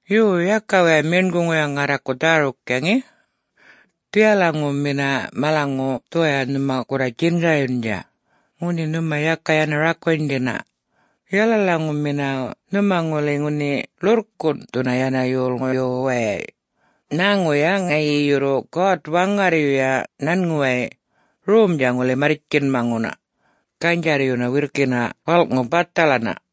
Yo, yaka waya meṉguŋuya ŋarraku dhäruktja, ŋe! Dhiyalaŋumina malaŋu dhuwaya nhuma gurra djingaryundja, ŋunhi nhuma yaka yana rakunydhina, yalalaŋumina nhuma ŋuli ŋunhi ḻurrkunꞌthuna yana yolŋuyu wayay nhäŋuya ŋayi yurru God-Waŋarryuya nhanŋuway romdja ŋuli marrtjinyamaŋuna, ganydjarryuna wirrkina walꞌŋu bathalana.”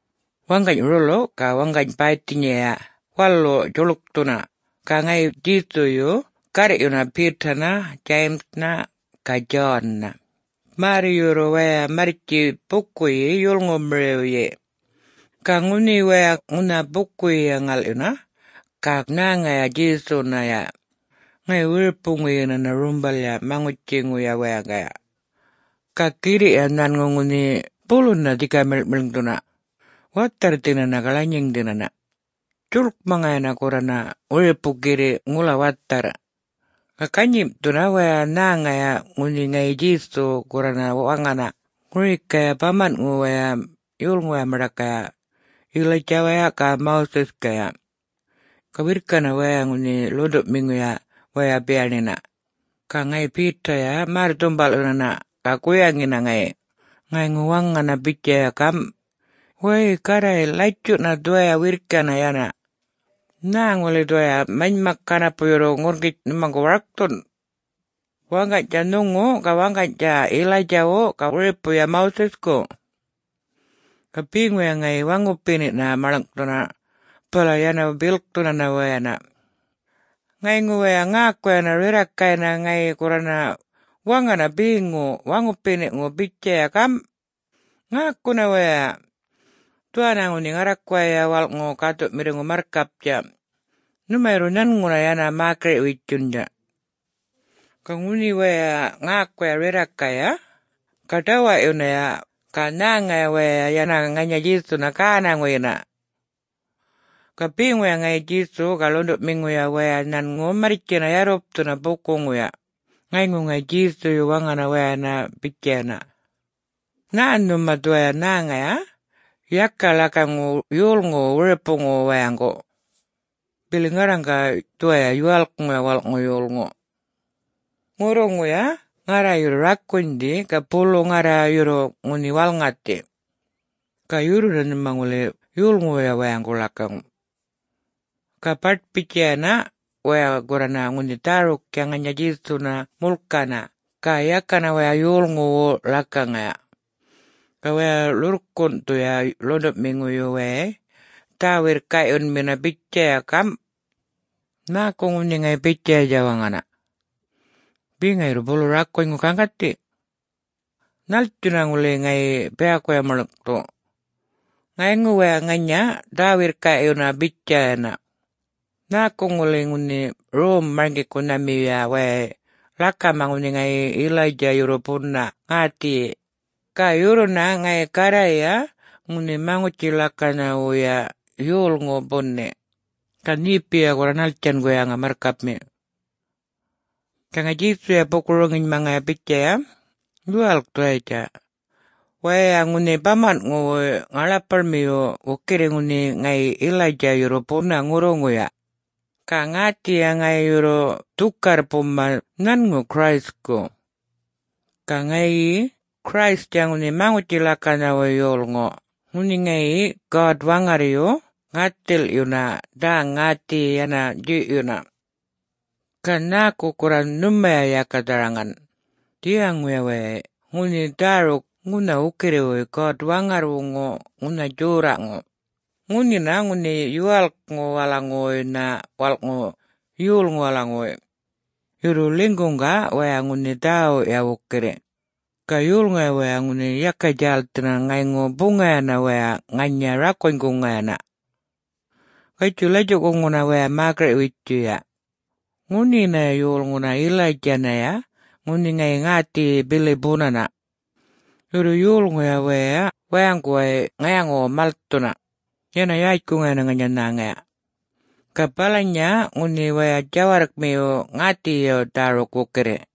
Waŋgany rulu ga waŋgany baythinyaya walu djuḻkthuna, ga ŋayi Djesuyu garrꞌyuna Peter-na, James-na, ga John-na, märr yurru waya marrtji bukuyi yolŋumiriwyi. Ga ŋunhi waya ŋunha bukuyiya ŋalꞌyuna ga nhäŋaya Djesunaya ŋayi wiripuŋuyinana rumbalya maŋutjiŋu wayaŋgaya. Ga girriꞌya nhanŋu ŋunhi buluna dhika miḻŋꞌmiḻŋdhuna, watharrthinana ga lanyiŋdhinana, djuḻkmaŋayana gurrana wiripu girriꞌ ŋula watharr. Ga ganyimꞌthuna waya nhäŋaya ŋunhi ŋayi Djesu gurrana waŋana ŋurikaya bamanꞌŋuwaya yolŋuwaya maṉḏakaya, Elijah-waya ga Moses-kaya. Ga wirrkina waya ŋunhi ḻuṉḏuꞌmiŋuya waya biyaṉiyina. Ga ŋayi Peter-ya märr-dhumbalꞌyunana ga guyaŋina ŋayi, ŋayŋu waŋana bitjaya gamꞌ, “Wäy Garray, latjuꞌna dhuwaya wirrkina yana! Nhä ŋuli dhuwaya manymak ŋanapu yurru ŋurrŋgitj nhumaŋgu warkthun?... waŋganydja nhuŋu ga waŋganydja Elijah-wu ga wiripuya Moses-ku?” Ga beŋuya ŋayŋu waŋupiniꞌna maḻŋꞌthuna bala yana bilkthunana wayana. Ŋayŋu waya ŋäkuyana rirrakaynha ŋayi gurrana waŋana beŋu waŋupiniꞌŋu bitjaya gamꞌ, “Ŋäkuna waya! Dhuwanna ŋunhi ŋarrakuwaya walꞌŋu gäthuꞌmiŋu marrkaptja. Nhuma yurru nhanŋuna yana mäkiriꞌ-witjundja!” Ga ŋunhi waya ŋäkuya rirrakaya, ga ḏawaꞌyunaya ga nhäŋaya waya yana ŋanya Djesuna gänaŋuyina. Ga beŋuya ŋayi Djesuya ga ḻuṉḏuꞌmiŋuya waya nhanŋu marrtjina yarrupthuna bukuŋuya. Ŋayŋu ŋayi Djesuyu waŋana wayana bitjayana, “Nhä nhuma dhuwaya nhäŋaya, yaka ḻakaŋu yolŋuwu wiripuŋuwu wayaŋgu. Bili ŋarraŋga dhuwaya Yuwalkŋuya Walꞌŋu Yolŋu. Ŋurruŋuya ŋarra yurru rakunydhi ga bulu ŋarra yurru ŋunhi walŋathi. Ga yurruna nhuma ŋuli yolŋuwuya wayaŋgu ḻakaŋu.” Ga baṯ-bitjayana waya gurrana ŋunhi dhäruktja ŋanya Djesuna mulkana ga yakana waya yolŋuwu ḻakaŋaya. Ga waya ḻurrkunꞌthuya ḻuṉḏuꞌmiŋuyu wayay dhä-wirrkaꞌyunmina bitjaya gamꞌ, “Nhäku ŋunhi ŋayi bitjayatja waŋana? Be ŋayi yurru bulu rakunyŋuyu gaŋgathi? Nhätjuyuna ŋuli ŋayi biyakuya maḻŋꞌthu?” Ŋayŋu waya ŋanya dhä-wirrkaꞌyuna bitjayana, “Nhäku ŋuli ŋunhi Rom-marŋgikunhamiyuya wayay ḻakama ŋunhi ŋayi Elijah yurru buna ŋäthiyi, ga yurruna ŋayi Garrayya ŋunhi Maŋutji-ḻakanhawuya yolŋu buni? Ga nhepiya gurra nhattjan guyaŋa, Marrkapmi?” Ga ŋayi Djesuya buku-roŋinymaŋaya bitjaya, “Yuwalk dhuwayitja. Waya ŋunhi bamanꞌŋuwuy ŋaḻapaḻmiyu wukirri ŋunhi ŋayi Elijah yurru buna ŋurruŋuya, ga ŋäthiyi ŋayi yurru dhukarr buma nhanŋu Christku. Ga ŋayi Christtja ŋunhi Maŋutji-ḻakanhawuy Yolŋu ŋunhi ŋayi God-Waŋarryu ŋäthilꞌyuna dhä-ŋäthiyi yana djuyꞌyuna. Ga nhäku gurra nhumaya yaka dharaŋan dhiyaŋuya wayay ŋunhi dhäruk ŋunha wukirriwuy God-Waŋarrwuŋu ŋunha djorraꞌŋu, ŋunhina ŋunhi Yuwalkŋuwalaŋuwuynha Walꞌŋu Yolŋuwalaŋuwuy? Yurru ḻinyguꞌga waya ŋunhi dhäwuꞌya wukirri, ga yolŋuya waya ŋunhi yaka djälthina ŋayŋu buŋayana waya ŋanya rakunyguŋayana. Gatjuy latjuꞌkuŋuna waya mäkiriꞌ-witjuya. Ŋunhinaya yolŋuna Elijah-naya ŋunhi ŋayi ŋäthiyi bili bunana. Yurru yolŋuya waya wayaŋguway ŋayaŋuwu malthuna, yana yätjkuŋayana ŋanya nhäŋaya. Ga balanya ŋunhi waya djawarrkmiyu ŋäthiyiya dhäruk wukirri.”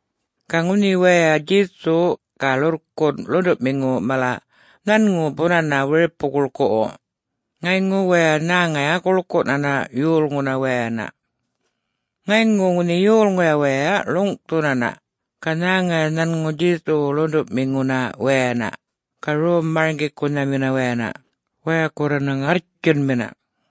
Ga ŋunhi waya Djesu ga ḻurrkunꞌ ḻuṉḏuꞌmiŋu mala nhanŋu bunana wiripu-guḻkuꞌwu, ŋayŋu waya nhäŋaya guḻkuꞌnana yolŋuna wayana. Ŋayŋu ŋunhi yolŋuya waya ḻuŋꞌthunana ga nhäŋaya nhanŋu Djesuwuna ḻuṉḏuꞌmiŋuna wayana ga rom-marŋgikunhamina wayana waya gurrana ŋarrtjunmina.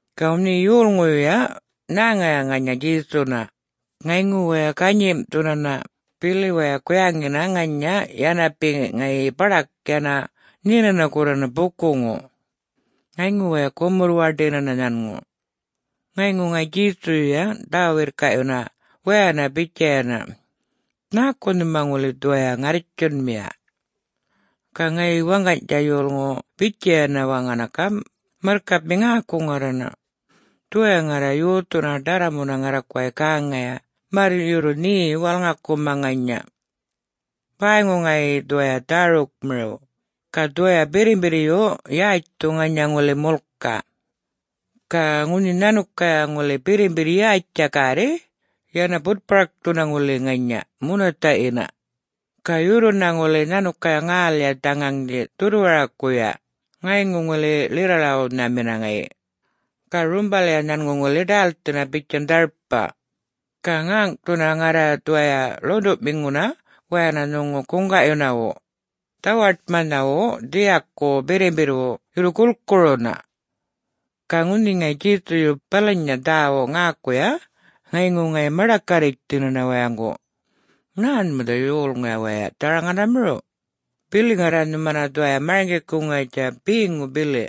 Ga ŋunhi yolŋuyuya nhäŋaya ŋanya Djesunaya ŋayŋu waya ganyimꞌthunana bili waya guyaŋina ŋanya yana be ŋayi baḏak yana nhinana gurrana bukuŋu. Ŋayŋu waya gumurr-waṉdinana nhanŋu. Ŋayŋu ŋayi Djesuyuya dhä-wirrkaꞌyuna wayana bitjaya, “Nhäku nhuma ŋuli dhuwaya ŋarrtjunmiya?” Ga ŋayi waŋganydja yolŋu bitjayana waŋana gamꞌ, “Marrkapmi ŋäku ŋarrana! Dhuwaya ŋarra yothuna ḏarramuna ŋarrakuway gäŋaya märr yurru nhe walŋakuma ŋanya. Bäyŋu ŋayi dhuwaya dhärukmiriw ga dhuwaya birrimbirryu yätjthu ŋanya ŋuli mulka. Ga ŋunhi nhanukaya ŋuli birrimbirr yätjtja gärri yana butparkthuna ŋuli ŋanya munathaꞌyina. Ga yurruna ŋuli nhanukaya ŋälya dhaŋaŋdhi dhurrwarakuya ŋayŋu ŋuli ḻirra-ḻawunhamina ŋayi. Ga rumbalya nhanŋu ŋuli ḏälthina bitjan dharpa. Ga ŋäŋꞌthuna ŋarra dhuwaya ḻuṉḏuꞌmiŋuna wayana nhuŋu guŋgaꞌyunawu, dhawaṯmanhawu dhiyaku birrimbirrwu, yurru gulkuruna.” Ga ŋunhi ŋayi Djesuyu balanya dhäwuꞌ ŋäkuya ŋayŋu ŋayi maḏakarritjthinana wayaŋgu, “Nhä nhuma dhuwaya yolŋuya waya dharaŋanamiriw, bili ŋarra nhumana dhuwaya marŋgikuŋayatja beŋu bili,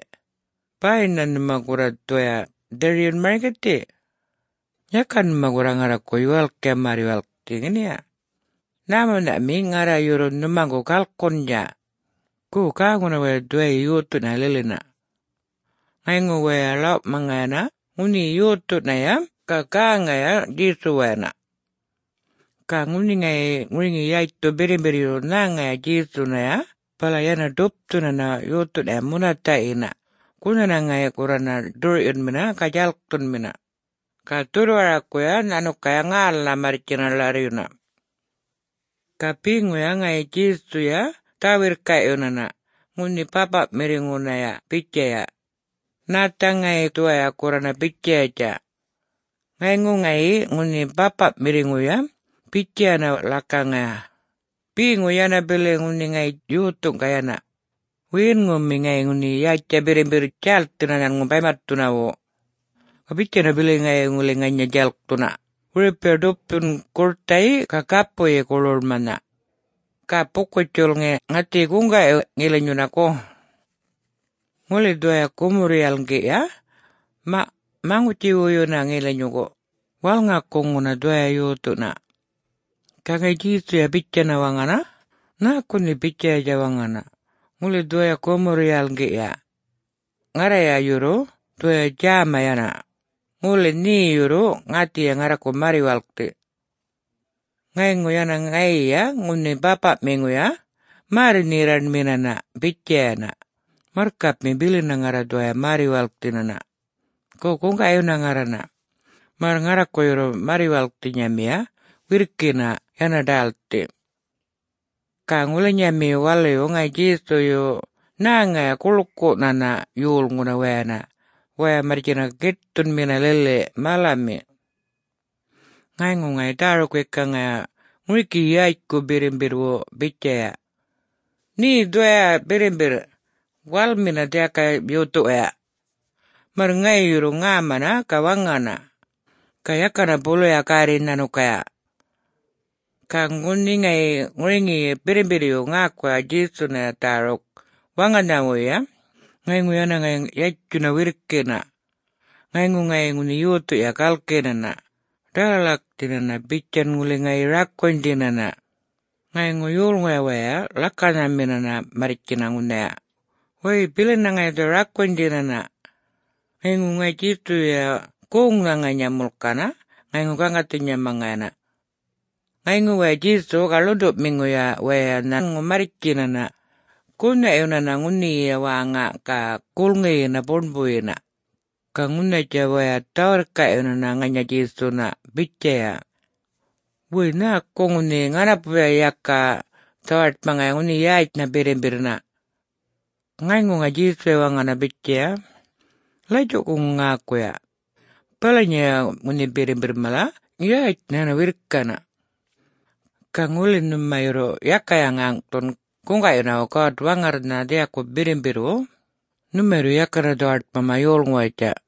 bay nhä nhuma gurra dhuwaya dhiryun marŋgithiya? Yaka nhuma gurra ŋarraku yuwalktja märr-yuwalkthi, ŋeniya? Nhämunyꞌnhami ŋarra yurru nhumaŋgu galkundja? Go, gäŋuna waya dhuwayi yothunaya lilina!” Ŋayŋu waya ḻawꞌmaŋayana ŋunhi yothunaya ga gäŋaya Djesuwayana. Ga ŋunhi ŋayi ŋuriŋi yätjthu birrimbirryu nhäŋaya Djesunaya bala yana ḏupthunana yothunaya munathaꞌyina gunhana ŋayi gurrana ḏurꞌyunmina ga djalkthunmina, ga dhurrwarakuya nhanukaya ŋälnha marrtjina ḻarryuna. Ga beŋuya ŋayi Djesuyuya dhä-wirrkaꞌyunana ŋunhi bäpaꞌmiŋunaya bitjaya, “Nhätha ŋayi dhuwaya gurrana bitjayatja?” Ŋayŋu ŋayi ŋunhi bäpaꞌmiŋuya bitjayana ḻakaŋaya, “Beŋu yana bili ŋunhi ŋayi yothu ga yana. Wiyinŋumi ŋayi ŋunhi yätjtja birrimbirr djälthina nhanŋu baymatthunawu. Ga bitjana bili ŋayi ŋuli ŋanya djalkthuna, wiripuya ḏupthun gurthayi ga gapuyi guḻwuḻmanha. Ga buku-djulŋi ŋäthiyi guŋgaꞌyu ŋilinyuna, gu? Ŋuli dhuwaya gumurr-yalŋgiꞌya, maꞌ maŋutji-wuyuna ŋilinyungu, walŋakuŋuna dhuwaya yothuna.” Ga ŋayi Djesuya bitjana waŋana, “Nhäku nhe bitjayatja waŋana, ‘Ŋuli dhuwayi gumurr-yalŋgiꞌya?’ Ŋarraya yurru dhuwaya djäma yana, ŋuli nhe yurru ŋäthiyi ŋarraku märr-yuwalkthi!” Ŋayŋu yana ŋayiya ŋunhi bäpaꞌmiŋuya märr-nherraṉminana bitjayana, “Marrkapmi, bilina ŋarra dhuwaya märr-yuwalkthinana. Go, guŋgaꞌyuna ŋarrana, märr ŋarraku yurru märr-yuwalkthinyamiya wirrkina yana ḏälthi!” Ga ŋulinyamiyu waluyu ŋayi Djesuyu nhäŋayana guḻkuꞌnana yolŋuna wayana waya marrtjina giṯthunmina lili malami. Ŋayŋu ŋayi dhäruk-wekaŋaya ŋuriki yätjku birrimbirrwu bitjaya, “Nhe dhuwaya birrimbirr, walmina dhiyakaya yothuwaya, märr ŋayi yurru ŋämana ga waŋana! Ga yakana buluya gärri nhanukaya!” Ga ŋunhi ŋayi ŋuriŋi birrimbirryu ŋäkuya Djesunaya dhäruk waŋanhawuyya, ŋayŋu yana ŋayi yatjuna wirrkina. Ŋayŋu ŋayi ŋunhi yothuya galkinana, ḏalalakthinana, bitjan ŋuli ŋayi rakunydhinana. Ŋayŋu yolŋuya waya ḻakanhamina marrtjina ŋunhaya, “Wäy bilina ŋayi dhuwaya rakunydhinana!” Ŋayŋu ŋayi Djesuyuya goŋnha ŋanya mulkana ŋayŋu gaŋgathinymaŋayana. Ŋayŋu waya Djesuya ga ḻuṉḏuꞌmiŋuya waya nhanŋu marrtjinana gunhaꞌyunana ŋunhiya wäŋa ga gulŋiyina buṉbuyina. Ga ŋunhayatja waya dhä-wirrkaꞌyunana ŋanya Djesuna bitjaya, “Wäy, nhäku ŋunhi ŋanapuya yaka dhawaṯmaŋaya ŋunhi yätjnha birrimbirrnha?” Ŋayŋu ŋayi Djesuya waŋana bitjaya, “Latjuꞌkuŋu ŋäkuya! Balanyaya ŋunhi birrimbirr mala yätjnha yana wirrkina. Ga ŋuli nhuma yurru yakaya ŋäŋꞌthun guŋgaꞌyunawu God-Waŋarrnha dhiyaku birrimbirrwu, nhumaya yurru yakana dhawaṯmama yolŋuwayatja.”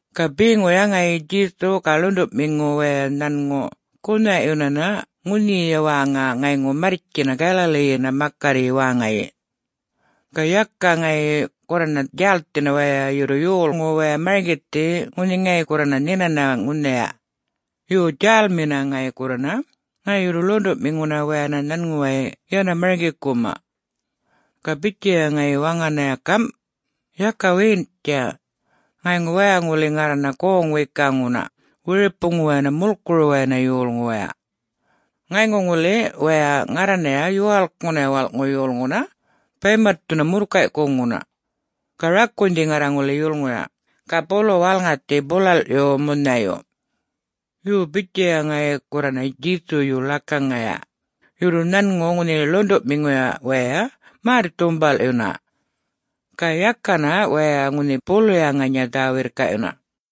Ga beŋuya ŋayi Djesu ga ḻuṉḏuꞌmiŋu waya nhanŋu gunhaꞌyunana ŋunhiya wäŋa ŋayŋu marrtjina Galilee-yina makarryi wäŋayi. Ga yaka ŋayi gurrana djälthina waya yurru yolŋu waya marŋgithi ŋunhi ŋayi gurrana nhinana ŋunhaya. Yo, djälmina ŋayi gurrana, ŋayi yurru ḻuṉḏuꞌmiŋuna wayana nhanŋuway yana marŋgikuma. Ga bitjaya ŋayi waŋanaya gamꞌ, “Yaka wiyinꞌtja, ŋayŋu waya ŋuli ŋarrana goŋ-wekaŋuna wiripuwayana mulkuruwayana yolŋuwaya. Ŋayŋu ŋuli waya ŋarranaya Yuwalkŋunaya Walꞌŋu Yolŋuna baymatthuna murrkaykuŋuna. Ga rakunydhi ŋarra ŋuli yulŋuya, ga bulu walŋathi bulalꞌyu munhayu.” Yo, bitjaya ŋayi gurrana Djesuyu ḻakaŋaya, yurru nhanŋu ŋunhi ḻuṉḏuꞌmiŋuya waya märr-dhumbalꞌyuna. Ga yakana waya ŋunhi buluya ŋanya dhä-wirrkaꞌyuna.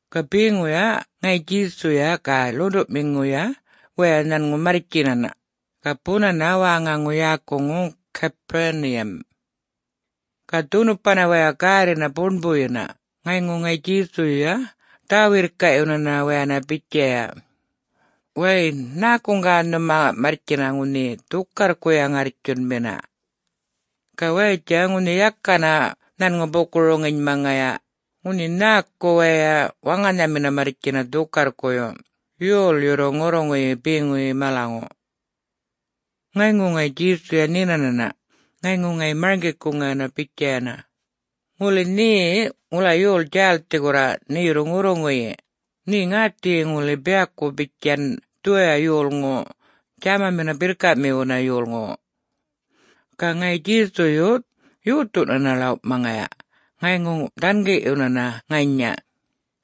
Ga beŋuya ŋayi Djesuya ga ḻuṉḏuꞌmiŋuya waya nhanŋu marrtjinana, ga bunana wäŋaŋu yäkuŋu Capernaum. Ga dhunupana waya gärrina buṉbuyina ŋayŋu ŋayi Djesuyuya dhä-wirrkaꞌyunana wayana bitjaya, “Wäy, nhäkuŋga nhuma marrtjina ŋunhi dhukarrkuya ŋarrtjunmina?” Ga wayatja ŋunhi yakana nhanŋu buku-roŋinymaŋaya ŋunhi nhäku waya waŋanhamina marrtjina dhukarrkuyu, yol yurru ŋurruŋuyi beŋu malaŋu. Ŋayŋu ŋayi Djesuya nhinanana, ŋayŋu ŋayi marŋgikuŋayana bitjayana, “Ŋuli nhe ŋula yol djälthi gurra nhe yurru ŋurruŋuyi, nhe ŋäthiyi ŋuli biyaku bitjan dhuwaya yolŋu djämamina birrkaꞌmiwuna yolŋuwu.” Ga ŋayi Djesuyuya yothunana ḻawꞌmaŋaya ŋayŋu dhangiꞌyunana ŋanya,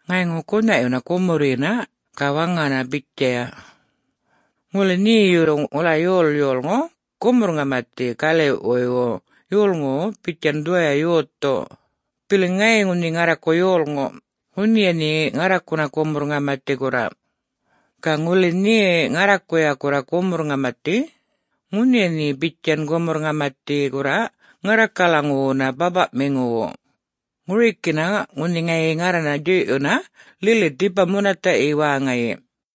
ŋayŋu gunhaꞌyuna gumurryina ga waŋana bitjaya, “Ŋuli nhe yurru ŋula yol yolŋu gumurr-ŋamathi galiꞌwuywu yolŋuwu bitjan dhuwaya yothu, bili ŋayi ŋunhi ŋarraku yolŋu, ŋunhiya nhe ŋarrakuna gumurr-ŋamathi gurra. Ga ŋuli nhe ŋarrakuya gurra gumurr-ŋamathi, ŋunhiya nhe bitjan gumurr-ŋamathi gurra ŋarrakalaŋuwuna bäpaꞌmiŋuwu, ŋurikina ŋunhi ŋayi ŋarrana djuyꞌyuna lili dhipaya munathaꞌyi wäŋayi.”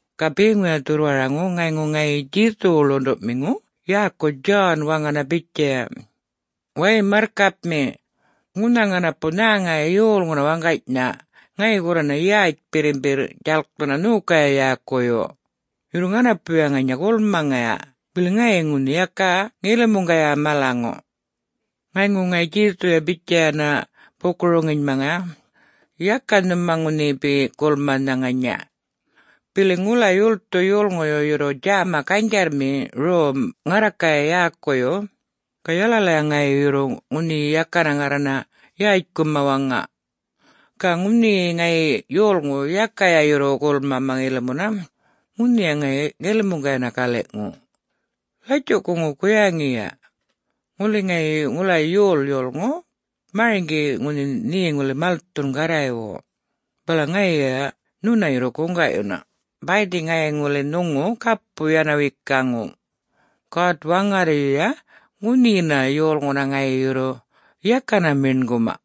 Ga beŋuya dhurrwaraŋu ŋayŋu ŋayi Djesuwu ḻuṉḏuꞌmiŋu yäku John waŋana bitjaya, “Way marrkapmi, ŋunha ŋanapu nhäŋaya yolŋuna waŋganynha ŋayi gurrana yätj birrimbirr djalkthuna nhokaya yäkuyu. Yurru ŋanapuya ŋanya gulmaŋaya bili ŋayi ŋunhi yaka ŋilimuŋgaya malaŋu.” Ŋayŋu ŋayi Djesuya bitjayana buku-roŋinymaŋaya, “Yaka nhuma ŋunhi be gulmanha ŋanya. Bili ŋula yolthu yolŋuyu yurru djäma ganydjarrmi rom ŋarrakaya yäkuyu, ga yalalaya ŋayi yurru ŋunhi yakana ŋarrana yätjkuma waŋa. Ga ŋunhi ŋayi yolŋu yakaya yurru gulmama ŋilimuna, ŋunhiya ŋayi ŋilimuŋgayana galiꞌŋu. Latjuꞌkuŋu guyaŋiya! Ŋuli ŋayi, ŋula yol yolŋu, marŋgi ŋunhi nhe ŋuli malthun Garraywu, bala ŋayiya nhuna yurru guŋgaꞌyuna, bäydhi ŋayi ŋuli nhuŋu gapu yana wekaŋu, God-Waŋarryuya ŋunhinaya yolŋuna ŋayi yurru yakana meṉguma.”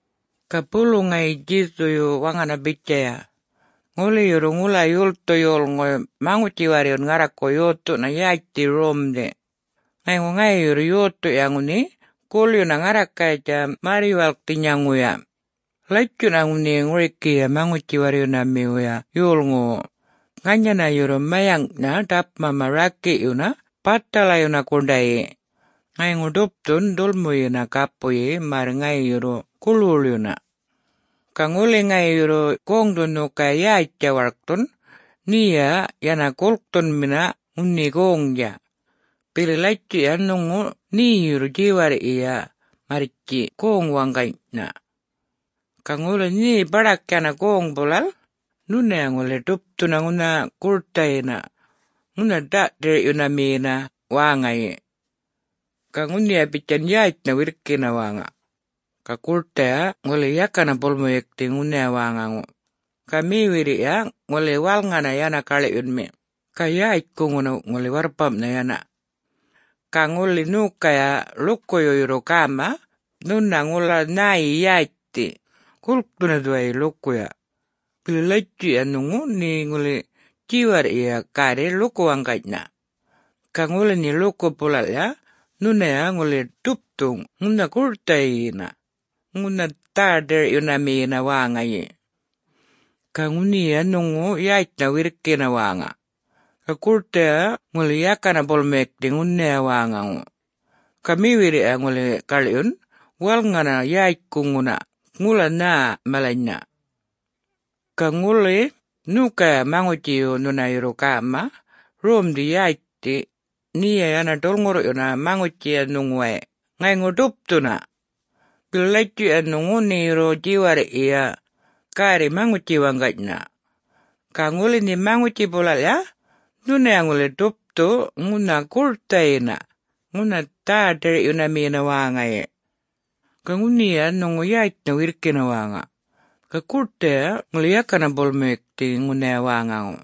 Ga bulu ŋayi Djesu waŋana bitjaya, “Ŋuli yurru ŋula yolthu yolŋuy maŋutji-warryun ŋarraku yothuna yätjthi romdhi, ŋayŋu ŋayi yurru yothuya ŋunhi gulyuna ŋarrakayatja märr-yuwalkthinyaŋuya, latjuꞌna ŋunhi ŋurikiya maŋutji-warryunamiwuya yolŋuwu ŋanyanaya yurru mayaŋꞌnha ḏapmama rakiꞌyuna bathalayuna guṉdayi, ŋayŋu ḏupthun dhulmuyina gapuyi, märr ŋayi yurru guḻwuḻyuna. Ga ŋuli ŋayi yurru goŋdhu nhokaya yätj warkthun, nheya yana gulkꞌthunmina ŋunhi goŋdja. Bili latjuꞌya nhuŋu nhe yurru djiwarrꞌyiya marrtji goŋ waŋganynha. Ga ŋuli nhe baḏak yana goŋ bulalꞌ, nhunaya ŋuli ḏupthu ŋunha gurthayina ŋunha dhä-ḏirꞌyunamiyina wäŋayi. [Ga ŋunhiya bitjan yätjnha wirrkina wäŋa. Ga gurthaya ŋuli yakana bolmuyukthi ŋunhaya wäŋaŋu. Ga mewirriya ŋuli walŋana yana gaḻꞌyunmi, ga yätjkuŋuna ŋuli warrpamꞌnha yana.] Ga ŋuli nhokaya ḻukuyu yurru gäma nhuna ŋula nhäyi yätjthi, gulkthuna dhuwayi ḻukuya. Bili latjuꞌya nhuŋu nhe ŋuli djiwarrꞌyiya gärri ḻuku waŋganynha. Ga ŋuli nhe ḻuku bulalꞌya nhunaya ŋuli ḏupthu ŋunha gurthaꞌyina ŋunha dhä-ḏirꞌyunamiyina wäŋayi. [Ga ŋunhiya nhuŋu yätjnha wirrkina wäŋa. Ga gurthaya ŋuli yakana bolmuyukthi ŋunhaya wäŋaŋu. Ga mewirriya ŋuli gaḻꞌyun walŋana yätjkuŋuna ŋula nhä malanynha.] Ga ŋuli nhokaya maŋutjiyu nhuna yurru gäma romdhi yätjthi, nheya yana ḏulŋurrꞌyuna maŋutjiya nhuŋuway ŋayŋu ḏupthuna. Bili latjuꞌya nhuŋu nhe yurru djiwarrꞌyiya gärri maŋutji waŋganynha. Ga ŋuli nhe maŋutji bulalꞌya, nhunaya ŋuli ḏupthu ŋunha gurthaꞌyina ŋunha dhä-ḏirꞌyunamiyina wäŋayi. ‘Ga ŋunhiya nhuŋu yätjnha wirrkina wäŋa. Ga gurthaꞌya ŋuli yakana bolmuyukthi ŋunhaya wäŋaŋu.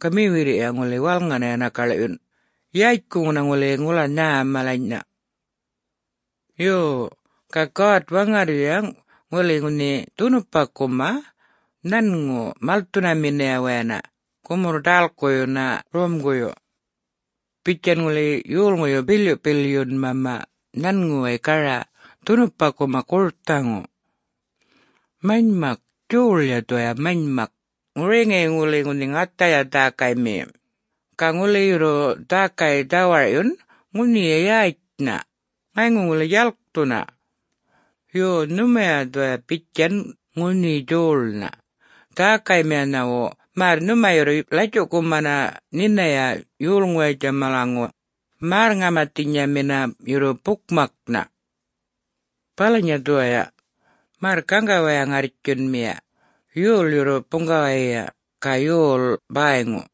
Ga mewirriya ŋuli walŋana yana gaḻyun, yätjkuŋuna ŋuli ŋula nhä malanynha.’ Yo, ga God-Waŋarryuya ŋuli ŋunhi dhunupakuma nhanŋu malthunaminaya wayana gumurr-ḏälkuyuna romguyu, bitjan ŋuli yolŋuyu bilyuꞌbilyunmama nhanŋuway gara dhunupakuma gurthaŋu. Manymak, djoḻya dhuwaya manymak, ŋuriŋi ŋuli ŋunhi ŋathaya dhäkaymiyi. Ga ŋuli yurru dhäkaya dhawarꞌyun ŋunhiya yätjnha, ŋayŋu ŋuli djalkthuna. Yo, nhumaya dhuwaya bitjan ŋunhi djoḻnha, dhäkaymiyanhawu märr nhuma yurru latjuꞌkumana nhinaya yolŋuwayatja malaŋu, märr-ŋamathinyamina yurru bukmaknha! [Balanya dhuwaya! Märr gaŋga waya ŋarrtjunmiya, yol yurru buŋgawayiya ga yol bäyŋu!]”